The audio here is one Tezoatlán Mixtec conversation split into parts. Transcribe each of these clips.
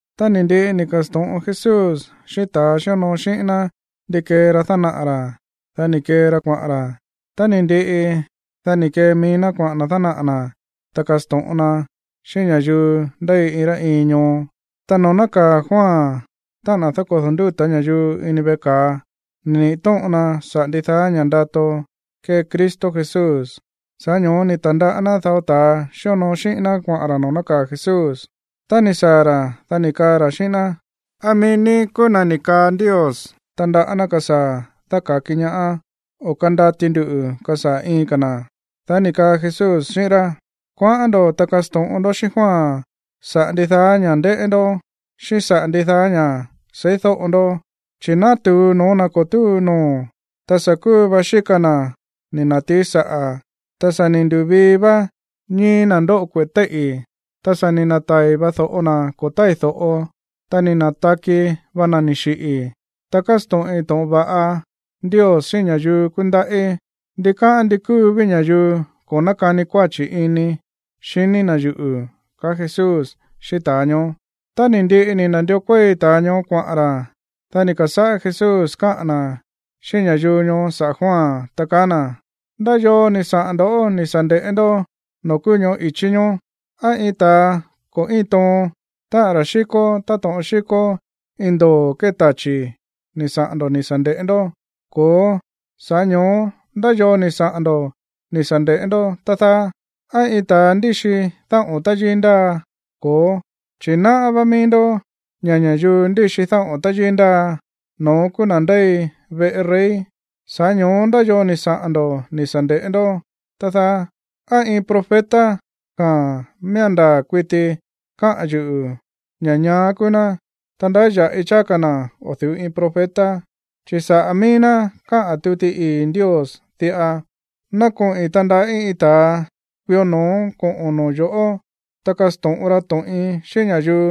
Tá ni̱ ndiꞌi ni̱ ka̱sto̱ꞌon Jesús xíꞌín ta̱ xíonoo xíꞌín ná ndi kee ra dánaꞌa̱ ra̱, dá ni̱ kee ra kuaꞌa̱n ra̱. Tá ni̱ ndiꞌi, dá ni̱ kee mií ná kuaꞌa̱n na̱ dánaꞌa̱ na̱, ta kasto̱ꞌon na xíꞌín ña̱yuu ndéi iin rá iin ñoo. Ta noo̱ nákaa̱ Juan, táꞌa̱n na̱ dákodo̱ ndúta̱ ña̱yuu, ini veꞌe ka̱a, ni̱ niꞌi̱ tóꞌon na saꞌa̱ ndidaá ña̱ ndato kée Cristo Jesús. Sa̱ꞌá ño̱ó ni̱ ta̱ndaꞌá ná dao ta̱ xíonoo xíꞌín ná kuaꞌa̱n ra̱ noo̱ nákaa̱ Jesús. Tá ni̱ saa̱ ra̱, dá ni̱ kaa ra̱ xíꞌín ná: ―¿Á mií ní kúú na̱ ni̱ kaa Ndios tandaꞌá ná kasaa̱ dáka̱ki ñaá, o á kandati ndu kasaa̱ iin ka̱ na̱? Dá ni̱ kaa Jesús xíꞌín rá: ―Kuaꞌán ndo̱, ta kasto̱ꞌon ndó xíꞌín Juan saꞌa̱ ndidaá ña̱ꞌa ndéꞌé ndó, xíꞌín saꞌa̱ ndidaá ña̱ seídóꞌo ndó. Chi̱ nátu̱u no̱ó na̱ ko̱ túu noo̱, ta sa̱ kúu va xíka na̱ ni̱ na̱tií saꞌa̱, ta sa̱ ni̱ ndu̱vii vá ñíi̱ na̱ ndóꞌo kueꞌe̱ téíꞌi̱, ta sa̱ ni̱ na̱tai̱ va do̱ꞌo na̱ ko̱ tái̱ do̱ꞌo, ta ni̱ na̱taki va na̱ ni̱ xiꞌi̱, ta kásto̱ꞌin to̱ꞌon va̱ꞌa Ndios xíꞌín ña̱yuu kúndaꞌí. Ndikáꞌán ndi kúu ví ña̱yuu ko̱ nákani kuáchi̱ ini xiní na̱ yuꞌu̱ ―kaá Jesús xíꞌín ta̱a ñoó. Tá ni̱ ndiꞌi ni̱ na̱ndió kuéi ta̱a ñoó kuaꞌa̱n ra̱, dá ni̱ ka̱sáꞌá Jesús káꞌa̱n na̱ xíꞌín ña̱yuu ñoó saꞌa̱ Juan, ta kaá na̱: ―¿Ndá yoo ni̱ saꞌa̱n ndo̱ꞌó ni̱ sa̱ nde̱ꞌé ndó noo̱ kúú ñóꞌo̱ ichí ñoó? ¿Á iin ta̱a ko̱ íin toon, táꞌa̱n ra̱ xíkó táto̱ꞌon xíkó iin ndoo̱ kée tachi̱ ni̱ saꞌa̱n ndo̱ ni̱ sa̱ nde̱ꞌé ndó? Ko̱ó, sa̱ꞌá ño̱ó, ¿ndá yoo ni̱ saꞌa̱n ndo̱ ni̱ sa̱ nde̱ꞌé ndó, tá dáá? ¿Á iin ta̱a ndíxi dáꞌo̱n táyíí ndáa? Ko̱ó, chi̱ náꞌá vá mií ndó ña̱ ña̱yuu ndíxi dáꞌo̱n táyíí ndáa, no̱ón kúú na̱ ndéi veꞌe rey. Sa̱ꞌá ño̱ó, ¿ndá yoo ni̱ saꞌa̱n ndo̱ ni̱ sa̱ nde̱ꞌé ndó, tá dáá? ¿Á iin profeta? Jaa̱n, miía̱n ndaa̱ kuiti kaá yuꞌu̱ ña̱ ñaá kúú ná, ta ndáya̱ꞌi cháá ka̱ na̱ o̱ du̱ú iin profeta. Chi̱ saꞌa̱ mií ná káꞌa̱n tuti ii̱ Ndios diꞌa: Ná koꞌi̱n tandaꞌí iin ta̱a kuió no̱ó koꞌo̱n noo̱ yo̱ꞌó, ta kasto̱ꞌon ra to̱ꞌin xíꞌín ña̱yuu,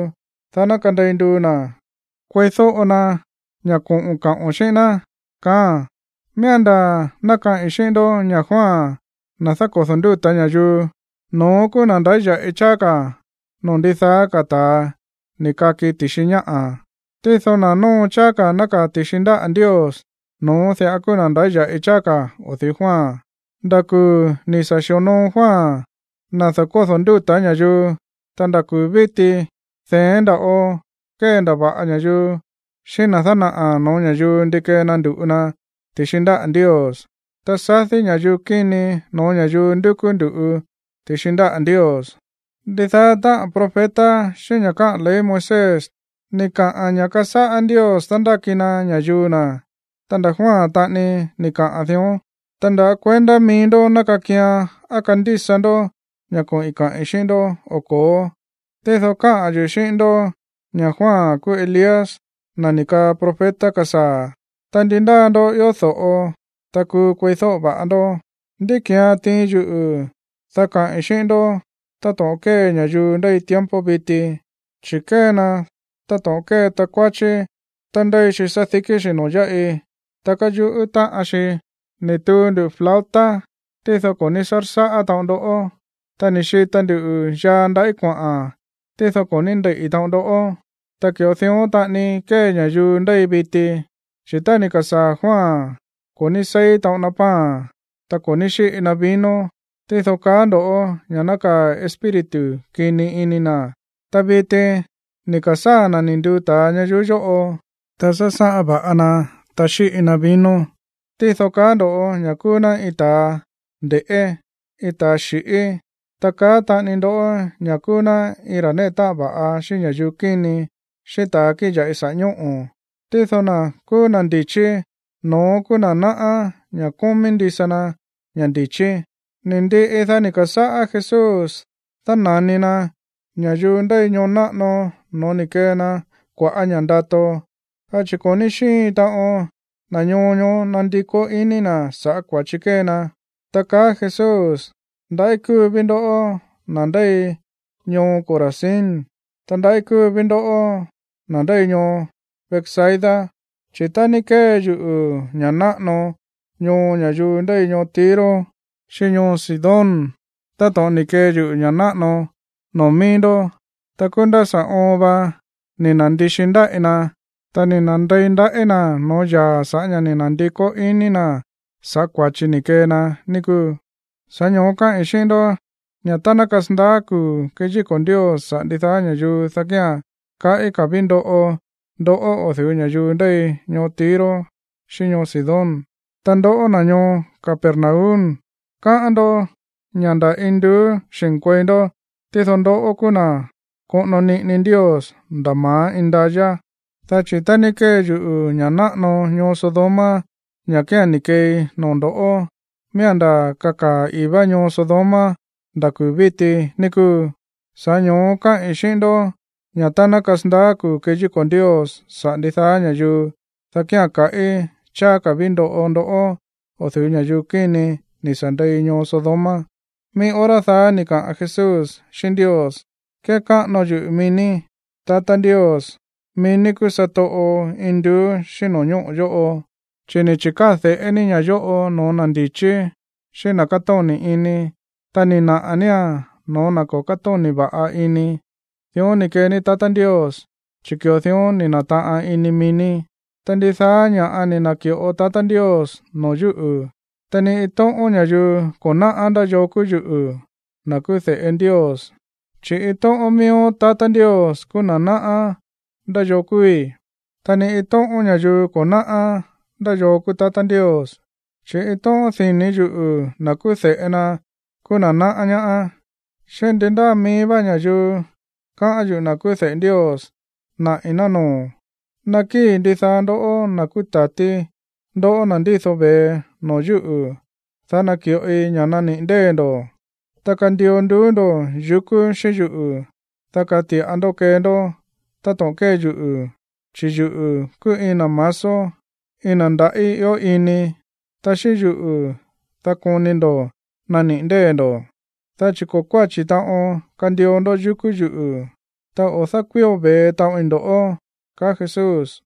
dá ná kandei nduu na̱ kueídóꞌo na ña̱ koꞌo̱n kaꞌo̱n xíꞌín ná. Miía̱n ndaa̱ ná kaꞌi̱n xíꞌín ndó ña̱ Juan, na̱ dákodo̱ ndúta̱ ña̱yuu, no̱ón kúú na̱ ndáya̱ꞌi cháá ka̱ noo̱ ndidaá ka̱ ta̱a ni̱ kaki ti̱xi ñáꞌa̱. Tído na̱ nóo cháá ka̱ nákaa̱ ti̱xi ndáꞌa̱ Ndios, no̱ón diꞌa kúú na̱ ndáya̱ꞌi cháá ka̱ o̱ du̱ú Juan. ’Nda̱ kuu̱ ni̱ sa̱ xi̱onoo Juan, na̱ dákodo̱ ndúta̱ ña̱yuu, ta nda̱ kuu̱ víti de̱én nda̱ꞌo kéndava̱ꞌa ña̱yuu xíꞌín na̱ dánaꞌa̱ no̱ó ña̱yuu ndi kee na ndu̱ꞌu na ti̱xi ndáꞌa̱ Ndios, ta sadí ña̱yuu kíni no̱ó ña̱yuu ndúkú ndu̱ꞌu ti̱xi ndáꞌa̱ Ndios. Ndidaá táꞌa̱n profeta xíꞌín ña̱ káꞌa̱n ley Moisés ni̱ kaꞌa̱n ña̱ kasáꞌá Ndios dándáki na ña̱yuu na̱, ta nda̱ Juan taꞌani ni̱ kaꞌa̱n dión. Ta ndá kuendá mií ndó ná kakian á kándísa ndó ña̱ koꞌi̱n kaꞌi̱n xíꞌín ndó o ko̱ó, tído káꞌa̱n yuꞌu̱ xíꞌín ndó ña̱ Juan kúú Elías, na̱ ni̱ kaꞌa̱n profeta kasaa̱. Ta ndi ndáa ndó ió do̱ꞌo, ta kúú kueídóꞌo va̱ꞌa ndó. ’¿Ndí ki̱án tiin yuꞌu̱, dá kaꞌi̱n xíꞌín ndó táto̱ꞌon kée ña̱yuu ndéi tiempo viti? Chi̱ kée na táto̱ꞌon kée takuáchí tá ndéi xi sádikí xi̱ noo̱ yáꞌi, ta káyuꞌú táꞌan xi: “Ni̱ tuu ndu̱ flauta, tído ko̱ ní sársáꞌá taꞌon ndoꞌó. Ta ni̱ xita ndu yaa ndaꞌí kuaꞌa̱n, tído ko̱ ní ndeiꞌi̱ taꞌon ndoꞌó.” Ta ki̱ꞌo dión taꞌani kée ña̱yuu ndéi viti, chi̱ tá ni̱ ka̱sáa̱ Juan, ko̱ ní seí taꞌon na pan, ta ko̱ ní xiꞌi na vino, tído kaá ndo̱ ña̱ nákaa̱ espíritu kini ini na̱. Ta viti ni̱ ka̱sáa̱ na̱ ni̱ nduu ta̱a ña̱yuu yóꞌo, ta sásáꞌan va̱ꞌa na, ta xíꞌi na vino, tído kaá ndo̱ ña̱ kúú ná iin ta̱a nde̱ꞌé, iin ta̱ xíꞌi. Ta kaá taꞌani ndó ña̱ kúú ná iin ra̱ néꞌe táꞌan va̱ꞌa xíꞌín ña̱yuu kíni, xíꞌín ta̱a kíꞌin ya̱ꞌi saꞌa̱ ñóꞌo̱. Tído na̱ kúú na̱ ndi̱chí, no̱ón kúú na̱ náꞌá ña̱ kómí ndisa na ña̱ ndi̱chí. Ni̱ ndiꞌi, dá ni̱ ka̱sáꞌá Jesús dána̱ni na ña̱yuu ndéi ñoo náꞌano no̱ó ni̱ kee na kua̱ꞌá ña̱ ndato, dá chi̱ ko̱ ní xíin taꞌon na̱ ñoo ñoó nandikó iní na̱ sa̱ꞌá kua̱chi kée na, ta kaá Jesús: ―¡Ndaꞌí kúú ví ndoꞌó, na̱ ndéi ñoo Corazín! Ta, ¡ndaꞌí kúú ví ndoꞌó, na̱ ndéi ñoo Betsaida! Chi̱ tá ní kée yuꞌu̱ ña̱ náꞌano no̱ó ña̱yuu ndéi ñoo Tiro xíꞌín ñoo Sidón táto̱ꞌon ni̱ kee yuꞌu̱ ña̱ náꞌano noo̱ mií ndó, ta kúú nda̱ sa̱ oon va ni̱ na̱ndixi ndaꞌí na̱, ta ni̱ na̱ndei ndaꞌí na̱ no̱ó yaa̱ sa̱ꞌá ña̱ ni̱ na̱ndikó iní na̱ sa̱ꞌá kua̱chi ni̱ kee na, ní kúu. Sa̱ꞌá ño̱ó káꞌi̱n xíꞌín ndó ña̱ tá ná kasandaá kuu̱ keyíko̱ Ndios saꞌa̱ ndidaá ña̱yuu, dá kía̱n kaꞌí ka̱ ví ndoꞌo ndoꞌó o̱ du̱ú ña̱yuu ndéi ñoo Tiro xíꞌín ñoo Sidón. Ta ndoꞌó, na̱ ñoo Capernaum, káꞌán ndó ña̱ nda̱ induú xi̱nkuei ndó, tído ndoꞌó kúú na̱ koꞌono niꞌini Ndios nda̱ ma̱á indayá, dá chi̱ tá ní kée yuꞌu̱ ña̱ náꞌano ñoo Sodoma, ña̱ kía̱n ni̱ keei noo̱ ndo̱ꞌó, miía̱n ndaa̱ kakaa̱ ii̱ vá ñoo Sodoma nda̱ kuu̱ víti, ní kúu. Sa̱ꞌá ño̱ó káꞌi̱n xíꞌín ndó ña̱ tá ná kasandaá kuu̱ keyíko̱ Ndios saꞌa̱ ndidaá ña̱yuu, dá kía̱n kaꞌí cháá ka̱ ví ndoꞌo ndoꞌó o̱ du̱ú ña̱yuu kíni ni̱ sa̱ ndei ñoo Sodoma. Mií hora daá ni̱ kaꞌa̱n Jesús xíꞌín Ndios: ―Kékáꞌano yuꞌu̱ mií ní, tatá Ndios, mií ní kúú satoꞌo induú xíꞌín no̱ñóꞌo̱ yóꞌo, chi̱ ni̱ chi̱káa̱ de̱ꞌé ní ña̱ yóꞌo no̱ó na̱ ndi̱chí, xíꞌín na̱ kátóni̱ ini. Ta ni̱ naꞌa̱ nía̱n no̱ó na̱ ko̱ kátóni̱ va̱ꞌa ini. Dión ni̱ kee ní, tatá Ndios, chi̱ ki̱ꞌo dión ni̱ na̱taꞌan ini mií ní. ’Ta ndidaá ña̱ꞌa ni̱ na̱ki̱ꞌo tatá Ndios noo̱ yúꞌu̱. Ta ni iin tóꞌón ña̱yuu ko̱ náꞌá ndá yoo kúú yuꞌu̱, na̱ kúú de̱ꞌe Ndios, chi̱ iin tóꞌón miíó tatá Ndios kúú na̱ náꞌá ndá yoo kúúí. Ta ni iin tóꞌón ña̱yuu ko̱ náꞌá ndá yoo kúú tatá Ndios, chi̱ iin tóꞌón dini̱ yuꞌu̱, na̱ kúú de̱ꞌe na, kúú na̱ náꞌá ñaá, xíꞌín ndi ndáa mií vá ña̱yuu káꞌán yuꞌu̱, na̱ kúú de̱ꞌe Ndios, naꞌi̱n ná noo̱. Nakíi̱ ndidaá ndoꞌó, na̱ kúú ta̱tí, ndoꞌó na̱ ndído ve̱e, noo̱ yúꞌu̱, dá naki̱ꞌoi ña̱ naniꞌi̱ ndée̱ ndo̱. Ta kandio nduú ndo̱ yukú xíꞌín yuꞌu̱, dá kati̱ꞌa ndó kee ndó táto̱ꞌon kée yuꞌu̱, chi̱ yuꞌu̱ kúú iin na̱ masó, iin na̱ ndaꞌí ió ini, ta xíꞌín yuꞌu̱, dá koni ndo̱ naniꞌi̱ ndée̱ ndo̱, dá chi̱ ko̱ kuáchi taꞌon kandio ndó yukú yuꞌu̱, ta o̱ dákuío ve̱e taꞌoin ndo̱ꞌó ―kaá Jesús.